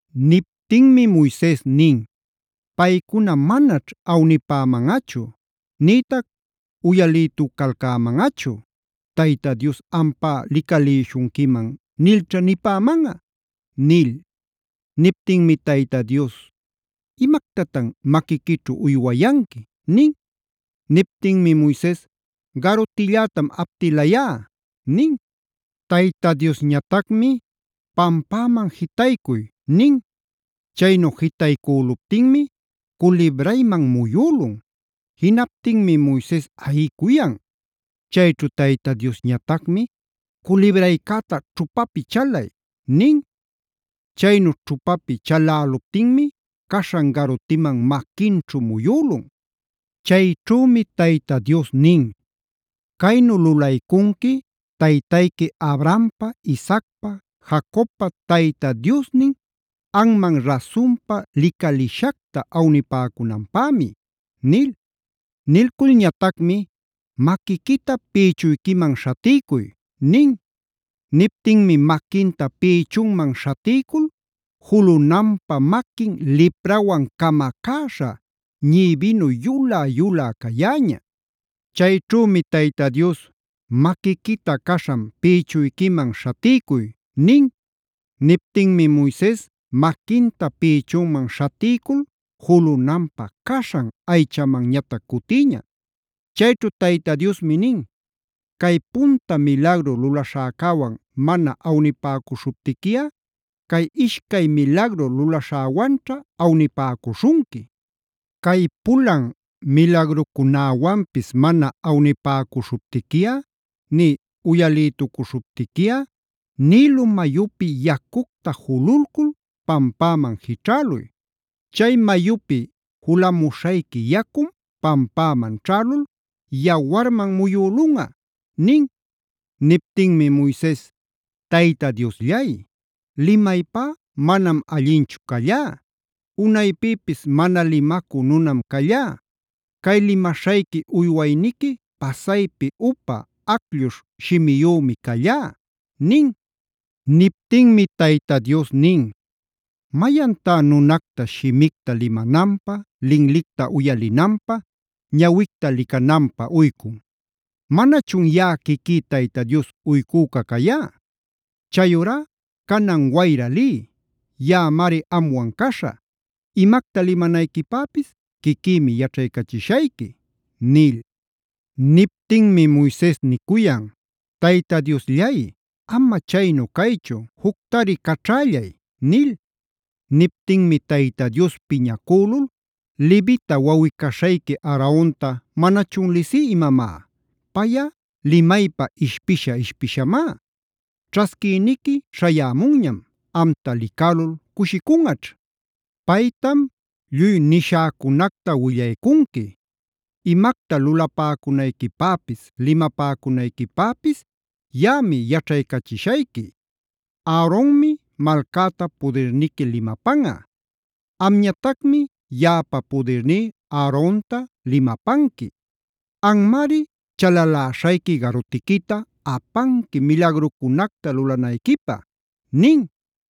Niptinmi Moises nin: “Paycuna manaćh awnipämanꞌachu, nïtac uyalïtucalcämanꞌachu. ¿Tayta Dios ampá licalïshunquiman? nilćha nipämanꞌa” nil. Niptinmi Tayta Dios: “¿Imactatan maquiquićhu uywayanqui?” nin. Niptinmi Moises: “Garutillätam aptilayá” nin. Tayta Diosñatacmi: “Pampäman jitaycuy” nin. Chaynu jitaycüluptinmi culibrayman muyülun. Jinaptinmi Moises ayicuyan. Chayćhu Tayta Diosñatacmi: “Culibraycäta ćhupapi chalay” nin. Chaynu ćhupapi chaläluptinmi caśhan garutiman maquinćhu muyülun. Chayćhümi Tayta Dios nin: “Caynu lulaycunqui taytayqui Abrahampa, Isaacpa, Jacobpa Tayta Diosnin anman rasunpa licalishacta awnipäcunanpämi” nil. Nilculñatacmi: “Maquiquita pïchuyquiman śhatiycuy” nin. Niptinmi maquinta pïchunman śhatiycul julunanpä maquin liprawan camacäśha, ñïbinu yulä-yulä cayäña. Chayćhümi Tayta Dios: “Maquiquita caśhan pïchuyquiman śhatiycuy” nin. Niptinmi Moises maquinta pïchunman śhatiycul julunanpä caśhan aychamanñatac cutïña. Chayćhu Tayta Diosmi nin: “Cay punta milagru lulaśhäcäwan mana awnipäcuśhuptiquiꞌa cay ishcay milagru lulaśhäwanćha awnipäcuśhunqui. Cay pulan milagrucunäwanpis mana awnipäcuśhuptiquiꞌa nï uyalïtucuśhuptiquiꞌa Nilo mayupi yacucta jululcul pampäman jićhäluy. Chay mayupi julamuśhayqui yacum pampäman ćhälul yawarman muyülunꞌa” nin. Niptinmi Moises: “Tayta Diosllay, limaypá manam allinchu callá. Unaypïpis mana limacü nunam callá. Cay limaśhayqui uywayniqui pasaypi upa, aclluśh shimiyümi callá” nin. Niptinmi Tayta Dios nin: “¿Mayantá nunacta shimicta limananpä, linlicta uyalinanpä, ñawicta licananpä uycun? ¿Manachun yaꞌa quiquí Tayta Dios uycüca cayá? Chayurá canan wayra liy. Yaꞌamari amwan caśhä; imacta limanayquipäpis quiquïmi yaćhaycachishayqui” nil. Niptinmi Moises nicuyan: “¡Tayta Diosllay! ama chaynu caychu juctari caćhällay” nil. Niptinmi Tayta Dios piñacülul: “¡Levita wawꞌi-caśhayqui Aaronta manachun lisí imamá! Payꞌa limaypa ishpisha-ishpishamá. Ćhasquïniqui śhayämunñam, amta licälul cushicunꞌaćh. Paytam lluy nishäcunacta willaycunqui. Imacta lulapäcunayquipäpis, limapäcunayquipäpis yaꞌami yaćhaycachishayqui. Aaronmi malcäta pudirniqui limapanꞌa. Amñatacmi yaꞌapa pudirní Aaronta limapanqui. Anmari chalaläśhayqui garutiquita apanqui milagrucunacta lulanayquipä” nin.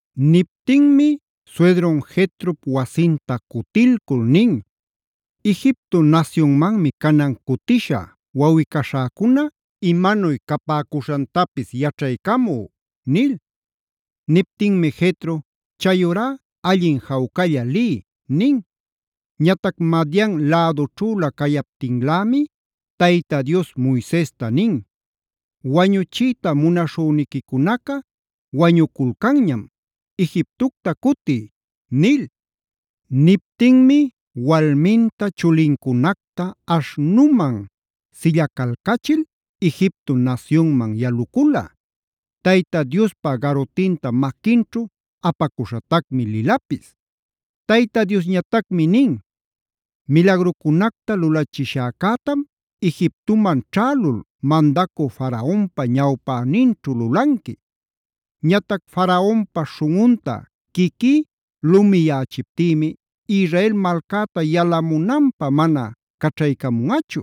Niptinmi suydrun Jetrop wasinta cutilcul nin: “Egipto nasyunmanmi canan cutishä wawꞌi-caśhäcuna imanuy cawsapäcuśhantapis yaćhaycamü” nil. Niptinmi Jetro: “Chayurá allin jawcalla liy” nin. Ñatac Madian lädućhülä cayaptinlämi Tayta Dios Moisesta nin: “Wañuchiyta munaśhüniquicunaca wañuculcanñam, Egiptocta cutiy” nil. Niptinmi walminta, chulincunacta aśhnuman sillacalcachil Egipto nasyunman yalucula. Tayta Diospa garutinta maquinćhu apacuśhatacmi lilapis. Tayta Diosñatacmi nin: “Milagrucunacta lulachishäcätam Egiptoman ćhälul mandacü Faraonpa ñawpäninćhu lulanqui. Ñatac Faraonpa śhunꞌunta quiquí lumiyächiptïmi Israel malcäta yalamunanpä mana caćhaycamunꞌachu.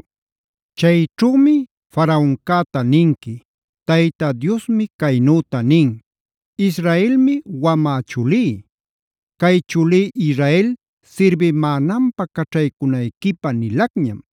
Chayćhümi Faraoncäta ninqui: Tayta Diosmi caynüta nin: ‘Israelmi wamä chulí. Cay chulí Israel sirbimänanpä caćhaycunayquipä nilacñam.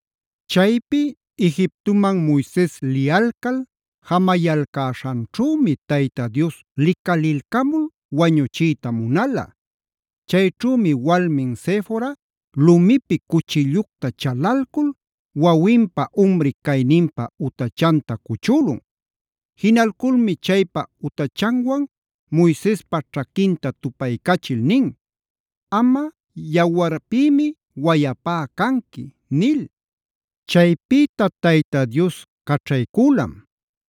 Chaypi Egiptoman Moises liyalcal jamayalcäśhanćhümi Tayta Dios licalilcamul wañuchiyta munala. Chayćhümi walmin Sefora lumipi cuchillucta chalalcul wawinpa umri cayninpä utachanta cuchülun. Jinalculmi chaypa utachanwan Moisespa ćhaquinta tupaycachil nin: “Amꞌa yawarpïmi wayapá canqui” nil. Chaypïta Tayta Dios caćhaycülam.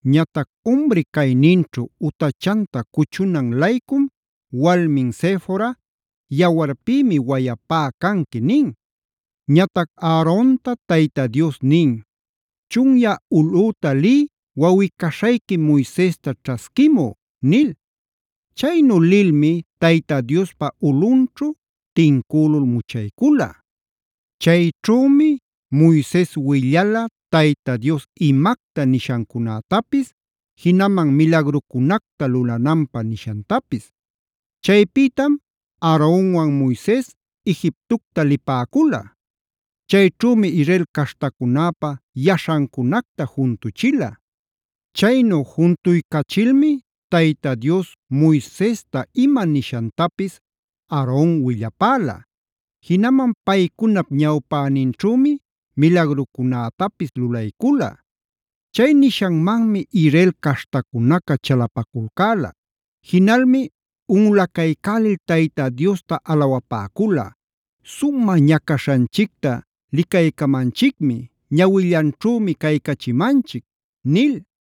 Ñatac umri cayninćhu utachanta cuchunan-laycum walmin Sefora: “Yawarpïmi wayapá canqui” nin. Ñatac Aaronta Tayta Dios nin: “Chunyä ulꞌüta liy wawꞌi-caśhayqui Moisesta ćhasquimú” nil. Chaynu lilmi Tayta Diospa ulꞌunćhu tincülul muchaycula. Chayćhümi Moises willala Tayta Dios imacta nishancunätapis, jinaman milagrucunacta lulananpä nishantapis. Chaypïtam Aaronwan Moises Egiptocta lipäcula. Chayćhümi Israel caśhtacunäpa yaśhancunacta juntuchila. Chaynu juntuycachilmi Tayta Dios Moisesta ima nishantapis Aaron willapäla. Jinaman paycunap ñawpäninćhümi milagrucunätapis lulaycula. Chay nishanmanmi Israel caśhtacunaca chalapaculcäla. Jinalmi unꞌulacaycälil Tayta Diosta alawapäcula: “Sumä ñacaśhanchicta licaycamanchicmi, ñawillanćhümi caycachimanchic” nil.